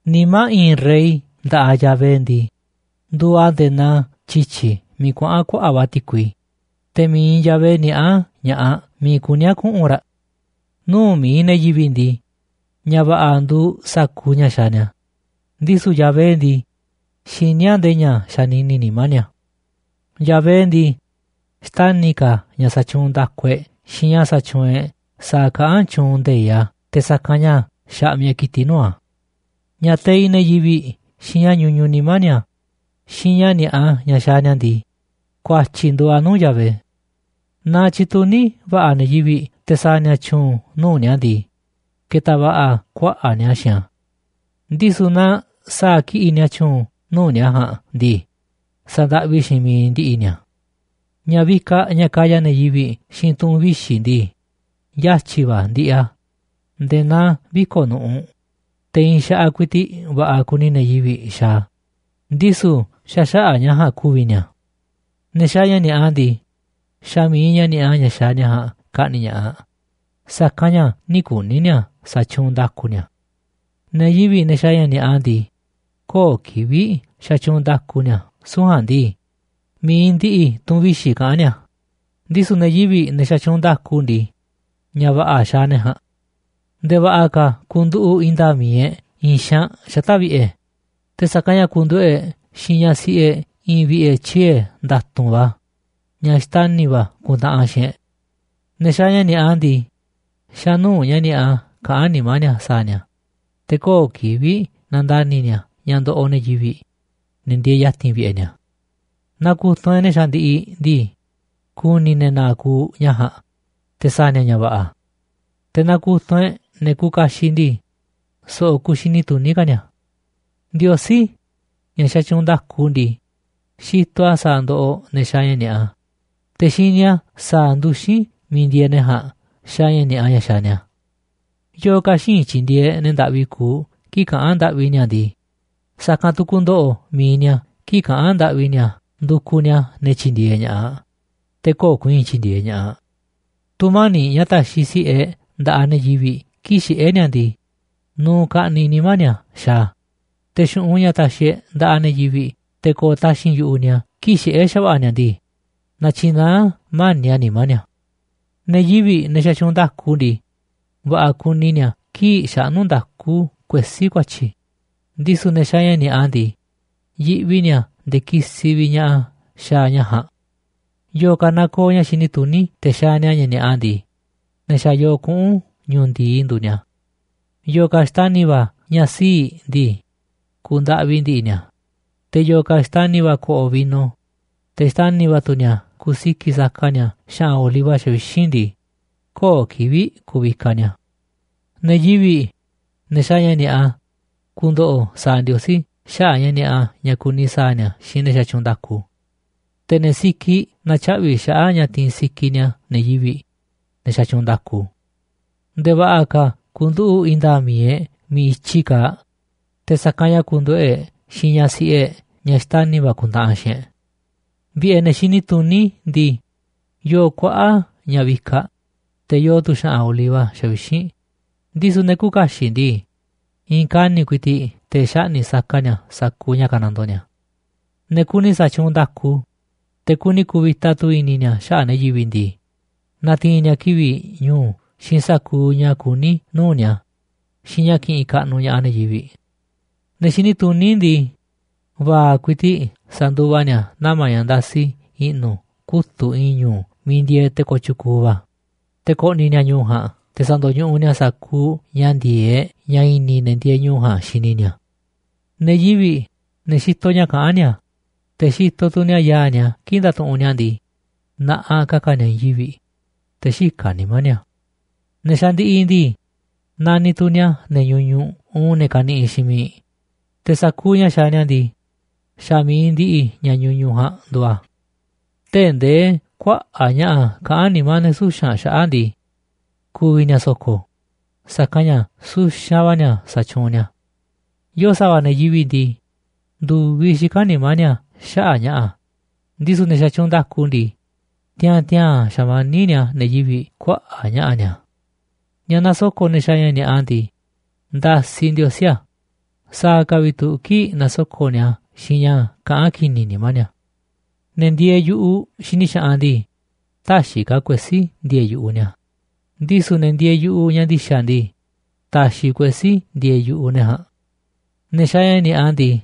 Nimá i̱i̱n rey nda̱ꞌaꞌ Yahvé ndii, nduuꞌ a̱ nde̱e̱ naa tyi̱tyi̱ miiꞌ kuaꞌa̱n kuaꞌa̱ꞌ va̱ ti̱kui, te̱ mi̱iꞌ Yahvé niaꞌá ña̱ꞌaꞌ miiꞌ kuní a̱ kuꞌu̱n raꞌ. Nuu̱ꞌ mi̱iꞌ ne̱ yivi̱ꞌ ndii, ña̱ va̱ꞌa̱ nduuꞌ sa̱kuuꞌ ña̱ xaaꞌ ni̱a̱, ndisu̱ Yahvé ndii, xiní a̱ nde̱e̱ ña̱ xanini nimá ni̱a̱. Yahvé ndii, xtani̱ ka̱ a̱ ña̱ sa̱tyuunꞌ nda̱ku e̱ꞌ xiinꞌ ña̱ sa̱tyuunꞌ e̱ꞌ sa̱a̱ kaꞌán tyuunꞌ nde̱iꞌ a̱ te̱ sa̱kanꞌ ña̱ xaꞌmiꞌ e̱ꞌ kitiꞌ nuu̱ꞌ a̱. Ña̱ teiꞌ ne̱ yivi̱ꞌ xiinꞌ ña̱ ñuñuꞌ nimá ni̱a̱ xiinꞌ ña̱ ni̱a̱ꞌa ña̱ xaaꞌ ni̱a̱ ndii, ku̱a̱tyi̱ nduuꞌ a̱ nuu̱ꞌ Yahvé. Naaꞌ tyituní va̱ꞌa̱ ne̱ yivi̱ꞌ te̱ sa̱a̱ ni̱a̱ tyu̱u̱n nuu̱ꞌ ni̱a̱ ndii, ke̱ta̱ va̱ꞌa̱ kuaꞌa̱ꞌ ni̱a̱ xiinꞌ a̱, ndisu̱ naaꞌ sa̱a̱ kiꞌi̱ꞌ ni̱a̱ tyu̱u̱n nuu̱ꞌ ni̱a̱ ja̱a̱nꞌ ndii, sa̱ndaꞌvi xiinꞌ miiꞌ ndi̱ꞌi̱ ni̱a̱. Ña̱ vikaꞌ ña̱ kaya ne̱ yivi̱ꞌ xiinꞌ tu̱ꞌu̱n vixi̱ ndii, yatyi̱ va̱ ndiꞌiꞌ a̱ nde̱e̱ naa viko̱ꞌ nu̱ꞌuꞌ, te̱ i̱i̱n xaꞌaꞌ ku̱i̱ti̱ꞌ va̱ꞌa̱ kuni ne̱ yivi̱ꞌ xaaꞌ a̱, ndisu̱ xa̱ xaꞌa̱ꞌ ña̱ ja̱a̱nꞌ ku̱vi̱ ni̱a̱. Ne̱ xaaꞌ ña̱ ni̱a̱ꞌa ndii, xa̱ mi̱iꞌ ña̱ ni̱a̱ꞌa ña̱ xaaꞌ ni̱a̱ ja̱a̱nꞌ ka̱ꞌni̱ꞌ ña̱ꞌaꞌ, sa̱kanꞌ ña̱ nï̱ kuni̱ ni̱a̱ sa̱tyuunꞌ nda̱ku ni̱a̱. Ne̱ yivi̱ꞌ, ne̱ xaaꞌ ña̱ ni̱a̱ꞌa ndii, köo̱ꞌ kivi̱ꞌ xatyuunꞌ nda̱ku ni̱a̱, süu̱ꞌ ja̱a̱nꞌ ndii, mi̱iꞌ ndiꞌiꞌ tu̱ꞌu̱n vixi̱ kaꞌán ni̱a̱, ndisu̱ ne̱ yivi̱ꞌ, ne̱ xatyuunꞌ nda̱ku ndii, ña̱ va̱ꞌa̱ xaaꞌ ne̱ ja̱a̱nꞌ. Nde̱e̱ va̱ꞌa̱ ka̱ ku̱nduꞌu̱ꞌ i̱i̱n nda̱a̱ꞌ mi̱iꞌ e̱ꞌ i̱i̱n xaanꞌ xata̱ꞌ vi̱ꞌe̱, te̱ sa̱kanꞌ ña̱ ku̱nduꞌu̱ꞌ e̱ꞌ xiinꞌ ñaꞌ siꞌi e̱ꞌ i̱i̱n vi̱ꞌe̱ tyie̱ nda̱tu̱nꞌ va̱ ñaꞌ xtani̱ va̱ ku̱ntaꞌanꞌ xiinꞌ e̱ꞌ. Ne̱ xaaꞌ ña̱ ni̱a̱ꞌa ndii, xa̱ nuu̱ꞌ ña̱ ni̱a̱ꞌa kaꞌán nimá ni̱a̱ sa̱a̱ ni̱a̱, te̱ köo̱ꞌ kivi̱ꞌ nandani̱ ni̱a̱ ña̱ ndoꞌoꞌ ne̱ yivi̱ꞌ, ne̱ ndieeꞌ ya̱ti̱n vi̱ꞌe̱ ni̱a̱. Naaꞌ ku̱tunꞌ e̱ꞌ ne̱ xandiꞌiꞌ ndii, ku̱ni̱ ne̱ na̱a̱ꞌ ku̱u̱ ña̱ ja̱a̱nꞌ, te̱ sa̱a̱ ni̱a̱ ña̱ va̱ꞌa̱. Te̱ naaꞌ ku̱tunꞌ e̱ꞌ ne̱ kuuꞌ kaxiꞌ ndii, so̱ꞌo̱ ku̱u̱ xini tuní ka̱ ni̱a̱. Ndiosí, ña̱ xatyuunꞌ nda̱ku ndii, xitoꞌ a̱ sa̱a̱ ndoꞌoꞌ ne̱ xaaꞌ ña̱ ni̱a̱ꞌa, te̱ xini a̱ sa̱a̱ nduxín miiꞌ ndieeꞌ ne̱ ja̱a̱nꞌ xaaꞌ ña̱ ni̱a̱ꞌa ña̱ xaaꞌ ni̱a̱. Yo̱o̱ ka̱ xïinꞌ tyi̱ndi̱e̱eꞌ ne̱ ndaꞌvi kuuꞌ kii̱ꞌ kaꞌán ndaꞌvi ni̱a̱ ndii, sa̱kanꞌ tu̱ ku̱ndo̱ꞌo̱ mi̱iꞌ ni̱a̱ kii̱ꞌ kaꞌa̱n ndaꞌvi ni̱a̱ ndukuꞌ ni̱a̱ ne̱ tyi̱ndi̱e̱eꞌ ña̱ꞌaꞌ, te̱ köo̱ꞌ ku̱i̱i̱n tyi̱ndi̱e̱eꞌ ña̱ꞌaꞌ. Tu̱mani̱ꞌ ña̱ taxiꞌ si̱ꞌe e̱ꞌ nda̱ꞌaꞌ ne̱ yivi̱ꞌ kii̱ꞌ xiꞌé ni̱a̱ ndii, nuuꞌ ka̱ꞌniꞌ nimá ni̱a̱ xaaꞌ a̱, te̱ xu̱ꞌunꞌ ña̱ taxiꞌ e̱ꞌ nda̱ꞌaꞌ ne̱ yivi̱ꞌ te̱ ko̱o̱ taxi̱nꞌ yu̱ꞌuꞌ ni̱a̱ kii̱ꞌ xiꞌé xa̱va̱ꞌa̱ ni̱a̱ ndii, natyinaá mani̱ꞌ a̱ nimá ni̱a̱. Ne̱ yivi̱ꞌ, ne̱ xatyuunꞌ nda̱ku ndii, va̱ꞌa̱ kuni ni̱a̱ kii̱ꞌ xaꞌnú nda̱ku kuesí ku̱a̱tyi̱, ndisu̱ ne̱ xaaꞌ ña̱ ni̱a̱ꞌa ndii, yiꞌvi ni̱a̱ nde̱e̱ kisiꞌ vi̱ꞌ ña̱ꞌaꞌ a̱ xaaꞌ ña̱ ja̱a̱nꞌ. Yo̱o̱ ka̱ nakooꞌ ña̱ xini tuní te̱ xaaꞌ ni̱a̱ ña̱ ni̱a̱ꞌa ndii, ne̱ xa̱ yoo kuꞌu̱n ñu̱u̱ ndi̱i nduuꞌ ni̱a̱. Yo̱o̱ ka̱ xtani̱ va̱ ña̱ sii̱ꞌ ndii, ku̱u̱ ndaꞌvi ndi̱ꞌi̱ ni̱a̱, te̱ yo̱o̱ ka̱ xtani̱ va̱ ko̱ꞌo̱ vino, te̱ xtani̱ va̱ tu̱ ni̱a̱ kusi̱ki̱ꞌ saka ni̱a̱ xa̱ꞌa̱n oliva xavixínꞌ ndii, köo̱ꞌ kivi̱ꞌ ku̱vikaꞌ ni̱a̱. Ne̱ yivi̱ꞌ, ne̱ xaaꞌ ña̱ ni̱a̱ꞌa, ku̱ndo̱ꞌo̱ sa̱a̱ Ndiosí xaꞌa̱ꞌ ña̱ ni̱a̱ꞌa ña̱ kuni sa̱a̱ ni̱a̱ xiinꞌ ne̱ xatyuunꞌ nda̱ku. Te̱ ne̱ sikiꞌ na̱tyaꞌvi̱ xaꞌa̱ꞌ ña̱ tiin sikiꞌ ni̱a̱ ne̱ yivi̱ꞌ, ne̱ xatyuunꞌ nda̱ku. Nde̱e̱ va̱ꞌa̱ ka̱ ku̱nduꞌu̱ꞌ i̱i̱n nda̱a̱ꞌ mi̱iꞌ e̱ꞌ miiꞌ i̱tyi kaaꞌ, te̱ sa̱kanꞌ ña̱ ku̱nduꞌu̱ꞌ e̱ꞌ xiinꞌ ñaꞌ siꞌi e̱ꞌ ñaꞌ xtani̱ va̱ ku̱ntaꞌanꞌ xiinꞌ e̱ꞌ. Vi̱ꞌe̱ ne̱ xini tuní ndii, yoo kuaꞌa̱ꞌ ña̱ vikaꞌ, te̱ yoo tu̱ xa̱ꞌa̱n oliva xavixínꞌ, ndisu̱ ne̱ küuꞌ kaxiꞌ ndii, i̱i̱n kani̱ꞌ ku̱i̱ti̱ꞌ te̱ xaꞌni̱ꞌ saka ni̱a̱ sa̱kuuꞌ ña̱ kanandoo ni̱a̱. Ne̱ kuni sa̱tyuunꞌ nda̱ku, te̱ kuni ku̱vi̱ta tu̱ i̱ni̱ ni̱a̱ xaꞌa̱ꞌ ne̱ yivi̱ꞌ ndii, na̱ti̱i̱n ni̱a̱ kivi̱ꞌ ñu̱u̱ xiinꞌ sa̱kuuꞌ ña̱ kuní nuu̱ꞌ ni̱a̱ xiinꞌ ña̱ ki̱ꞌi̱n kaꞌnuꞌ ña̱ꞌaꞌ ne̱ yivi̱ꞌ. Ne̱ xini tuní ndii, va̱a̱ꞌ ku̱i̱ti̱ꞌ sa̱nduva ni̱a̱ nama̱ ña̱ ndasiꞌ i̱ꞌnu̱ kutu̱ꞌ i̱i̱n ñu̱u̱ miiꞌ ndieeꞌ te̱ kooꞌ tyukuuꞌ va̱, te̱ ko̱ꞌni̱ ni̱a̱ ñu̱u̱ ja̱a̱nꞌ te̱ sa̱ndo̱ñuꞌuꞌ ni̱a̱ sa̱kuuꞌ ña̱ ndi̱e̱eꞌ ña̱ i̱ni̱ ne̱ ndieeꞌ ñu̱u̱ ja̱a̱nꞌ xini ni̱a̱. Ne̱ yivi̱ꞌ, ne̱ xitoꞌ ña̱ kaꞌán ni̱a̱, te̱ xitoꞌ tu̱ ni̱a̱ yaa̱ꞌ ni̱a̱ kii̱ꞌ ndatuꞌunꞌ ni̱a̱ ndii, na̱ꞌaꞌ ka̱ka̱ ni̱a̱ i̱i̱n yivi̱ꞌ, te̱ xïkaꞌ nimá ni̱a̱. Ne̱ xandiꞌiꞌ ndii, naniꞌ tu̱ ni̱a̱ ne̱ ñuñuꞌ uun ne̱ kaniꞌiꞌ xiinꞌ miiꞌ, te̱ sa̱kuuꞌ ña̱ xaaꞌ ni̱a̱ ndii, xa̱ mi̱iꞌ ndiꞌiꞌ ña̱ ñuñuꞌ ja̱a̱nꞌ nduuꞌ a̱. Tee̱ꞌ ndee kuaꞌa̱ꞌ ña̱ꞌa̱ kaꞌán nimá ne̱ suxa̱nꞌ xaꞌa̱ꞌ ndii, ku̱vi̱ ni̱a̱ so̱ko̱, sa̱kanꞌ ña̱ suxanꞌ va̱ ni̱a̱ sa̱tyuunꞌ ni̱a̱. Yo̱o̱ sa̱va̱ ne̱ yivi̱ꞌ ndii, ndu̱viꞌ xikán nimá ni̱a̱ xaꞌa̱ꞌ ña̱ꞌa̱, ndisu̱ ne̱ xatyuunꞌ nda̱ku ndii, tiaa̱n tiaa̱n xamaníꞌ ni̱a̱ ne̱ yivi̱ꞌ kuaꞌa̱ꞌ ña̱ꞌa̱ ni̱a̱. Ña̱ nasoko̱ꞌ ne̱ xaaꞌ ña̱ ni̱a̱ꞌa ndii, ndasiꞌ Ndiosí a̱, sa̱a̱ ka̱ vi̱ꞌ tu̱ kii̱ꞌ nasoko̱ꞌ ni̱a̱ a̱ xiinꞌ ña̱ kaꞌán ki̱ni̱ nimá ni̱a̱. Ne̱ ndieeꞌ yu̱ꞌuꞌ xini xaꞌanꞌ ndii, täxiꞌ ka̱ kuesí ndi̱e̱e̱ yu̱ꞌuꞌ ni̱a̱, ndisu̱ ne̱ ndieeꞌ yu̱ꞌuꞌ ña̱ ndi̱xa̱ ndii, ta̱xi̱ kuesí ndi̱e̱e̱ yu̱ꞌuꞌ ne̱ ja̱a̱nꞌ. Ne̱ xaaꞌ ña̱ ni̱a̱ꞌa ndii,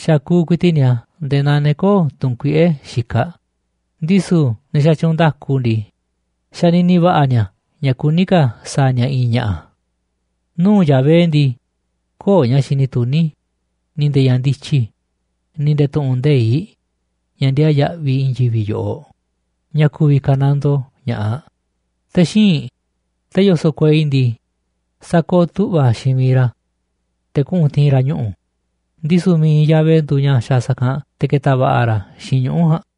xakuuꞌ ku̱i̱ti̱ꞌ ni̱a̱ nde̱e̱ naa ne̱ kö̱o̱ tu̱nkuiꞌe̱ xikaꞌ, ndisu̱ ne̱ xatyuunꞌ nda̱ku ndii, xanini va̱ꞌa̱ ni̱a̱ ña̱ kuní ka̱ sa̱a̱ ni̱a̱ i̱i̱n ña̱ꞌa̱. Nuu̱ꞌ Yahvé ndii, köo̱ꞌ ña̱ xini tuní ni̱ nde̱e̱ ña̱ ndityi ni̱ nde̱e̱ tu̱ꞌu̱n nde̱iꞌ, ña̱ ndiaa yaꞌviꞌ i̱i̱n yivi̱ꞌ yoꞌoꞌ, ña̱ ku̱vi̱ ka̱nandoo ña̱ꞌaꞌ a̱. Te̱ xíinꞌ, te̱ yoso̱ꞌ kuei ndii, sakooꞌ tu̱ꞌva̱ xiinꞌ miiꞌ ra̱ te̱ kuꞌu̱n ti̱i̱n ra̱ ñuꞌu̱, ndisu̱ mi̱iꞌ Yahvé nduuꞌ ña̱ xaaꞌ sa̱kanꞌ te̱ ketaꞌ va̱ꞌa̱ ra̱ xiinꞌ ñuꞌu̱ ja̱a̱nꞌ.